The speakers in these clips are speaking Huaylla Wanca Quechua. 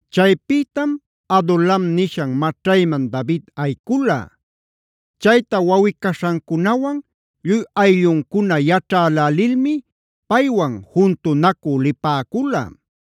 Chaypïtam Adulam nishan maćhaymana David ayicula. Chayta wawꞌi-caśhancunawan lluy aylluncuna yaćhälälilmi paywan juntunacü lipäcula.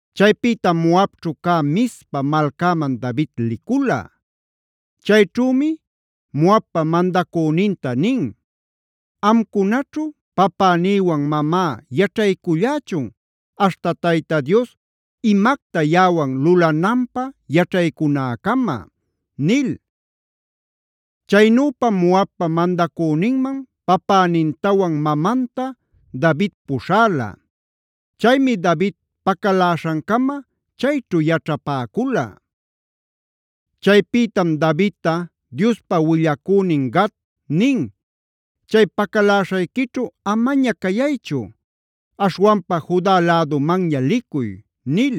Chaypïtam Moabćhu cä Mizpa malcäman David licula. Chayćhümi Moabpa mandacüninta nin: “Amcunaćhu papänïwan mamá yaćhaycullächun aśhta Tayta Dios imacta yaꞌawan lulananpä yaćhaycunäcama” nil. Chaynüpam Moabpa mandacüninman papänintawan mamanta David puśhäla. Chaymi David pacaläśhancama chayćhu yaćhapäcula. Chaypïtam Davidta Diospa willacünin Gad nin: “Chay pacaläśhayquićhu amaña cayaychu. Aśhwanpa Juda lädumanña licuy” nil.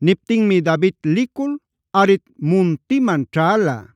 Niptinmi David licul Haret muntiman ćhäla.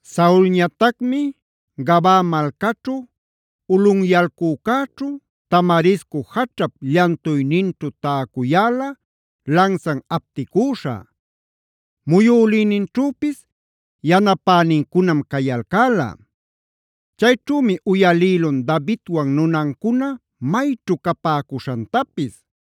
Saulñatacmi Gabaa malcaćhu, ulꞌunyalcücäćhu, tamarisco jaćhap llantuyninćhu täcuyäla lansan apticüśha. Muyülïninćhüpis yanapänincunam cayalcäla. Chayćhümi uyalïlun Davidwan nunancuna mayćhu capäcuśhantapis.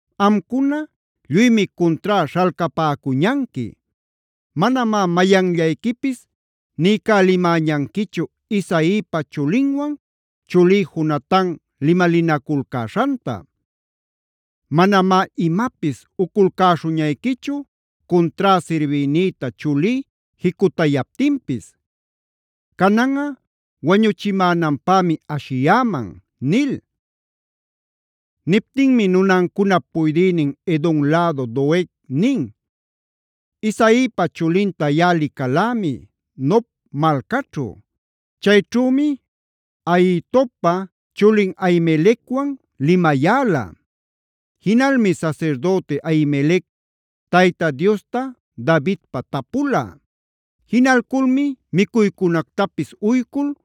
Amcuna lluymi cuntrá śhalcapäcuñanqui. Manamá mayanllayquipis niycälimäñanquichu Isaipa chulinwan chulí Jonatan limalinaculcäśhanta. Manamá imapis uculcäśhuñayquichu cuntrá sirbïnïta chulí jicutayaptinpis. Cananꞌa wañuchimänanpämi ashiyäman” nil. Niptinmi nunancunap puydïnin Edom lädu Doeg nin: “Isaipa chulinta yaꞌa licalämi Nob malcaćhu. Chayćhümi Ahitobpa chulin Ahimelecwan limayäla. Jinalmi sasirdüti Ahimelec Tayta Diosta Davidpä tapula. Jinalculmi micuycunactapis uycul,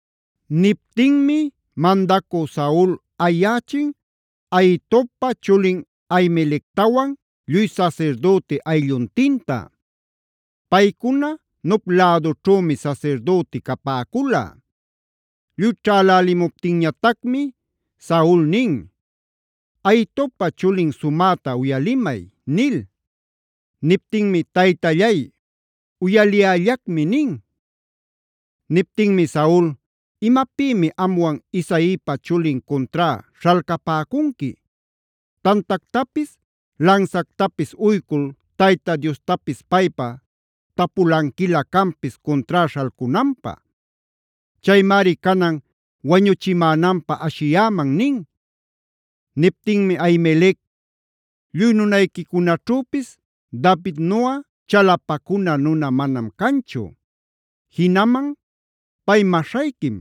Niptinmi mandacü Saul ayächin Ahitobpa chulin Ahimelectawan lluy sasirdüti aylluntinta; paycuna Nob lädućhümi sasirdüti capäcula. Lluy ćhälälimuptinñatacmi, Saul nin: “Ahitobpa chulin sumäta uyalimay” nil. Niptinmi: “Taytallay, uyaliyällacmi” nin. Niptinmi Saul: “¿Imapïmi amwan Isaipa chulin cuntrá śhalcapäcunqui? Tantactapis, lansactapis uycul Tayta Diostapis paypä tapulanquilä canpis cuntrá śhalcunanpä. Chaymari canan wañuchimänanpä ashiyäman” nin. Niptinmi Ahimelec: “Lluy nunayquicunaćhüpis Davidnuꞌa chalapacuna nuna manam canchu. Jinaman pay maśhayquim,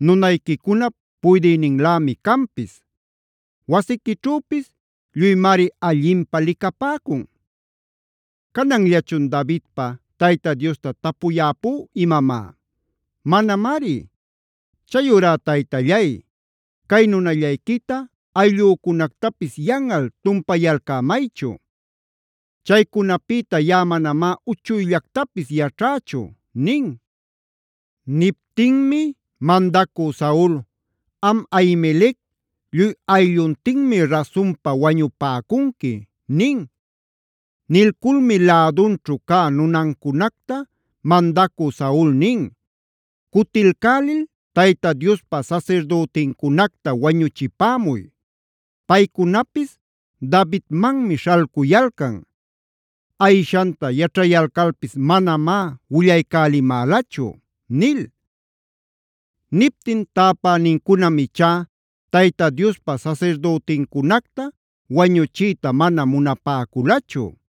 nunayquicunap puydïninlämi canpis. Wasiquićhüpis lluymari allinpä licapäcun. ¿Cananllachun Davidpa Tayta Diosta tapuyäpú imamá? Manamari. Chayurá taytallay, cay nunallayquita, ayllücunactapis yanꞌal tumpayalcämaychu. Chaycunapïta yaꞌa manamá uchuyllactapis yaćhächu” nin. Niptinmi mandacü Saul: “Am Ahimelec, lluy aylluntinmi rasunpa wañupäcunqui” nin. Nilculmi lädunćhu cä nunancunacta mandacü Saul nin: “Cutilcälil Tayta Diospa sasirdütincunacta wañuchipämuy. Paycunapis Davidmanmi śhalcuyalcan. Ayishanta yaćhayalcalpis manamá willaycälimälachu” nil. Niptin täpänincunam ichá Tayta Diospa sasirdütincunacta wañuchiyta mana munapäculachu.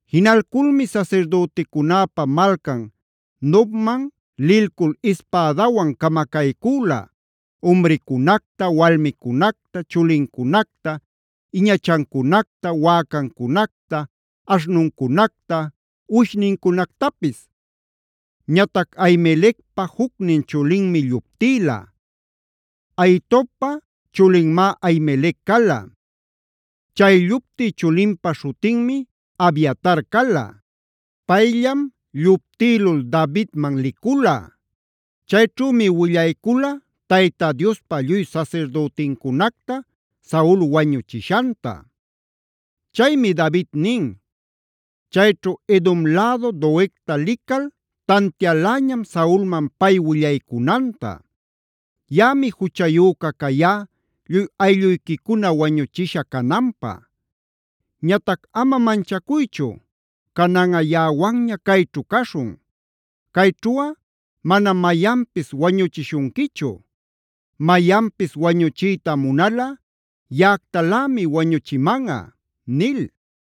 Jinalculmi sasirdüticunäpa malcan Nobman lilcul ispädawan camacaycüla: umricunacta, walmicunacta, chulincunacta, iñachancunacta, wäcancunacta, aśhnuncunacta, uwishnincunactapis. Ñatac Ahimelecpa jucnin chulinmi lluptïla. Ahitobpa chulinmá Ahimelec cala; chay lluptï chulinpa śhutinmi Abiatar cala. Payllam lluptïlul Davidman licula. Chayćhümi willaycula Tayta Diospa lluy sasirdütincunacta Saul wañuchishanta. Chaymi David nin: “Chayćhu Edom lädu Doegta lical tantialäñam Saulman pay willaycunanta. Yaꞌami juchayüca cayá lluy aylluyquicuna wañuchisha cananpä. Ñatac ama manchacuychu; cananꞌa yaꞌawanña cayćhu caśhun. Cayćhuꞌa manam mayanpis wañuchishunquichu. Mayanpis wañuchiyta munalꞌa yaꞌactalämi wañuchimanꞌa” nil.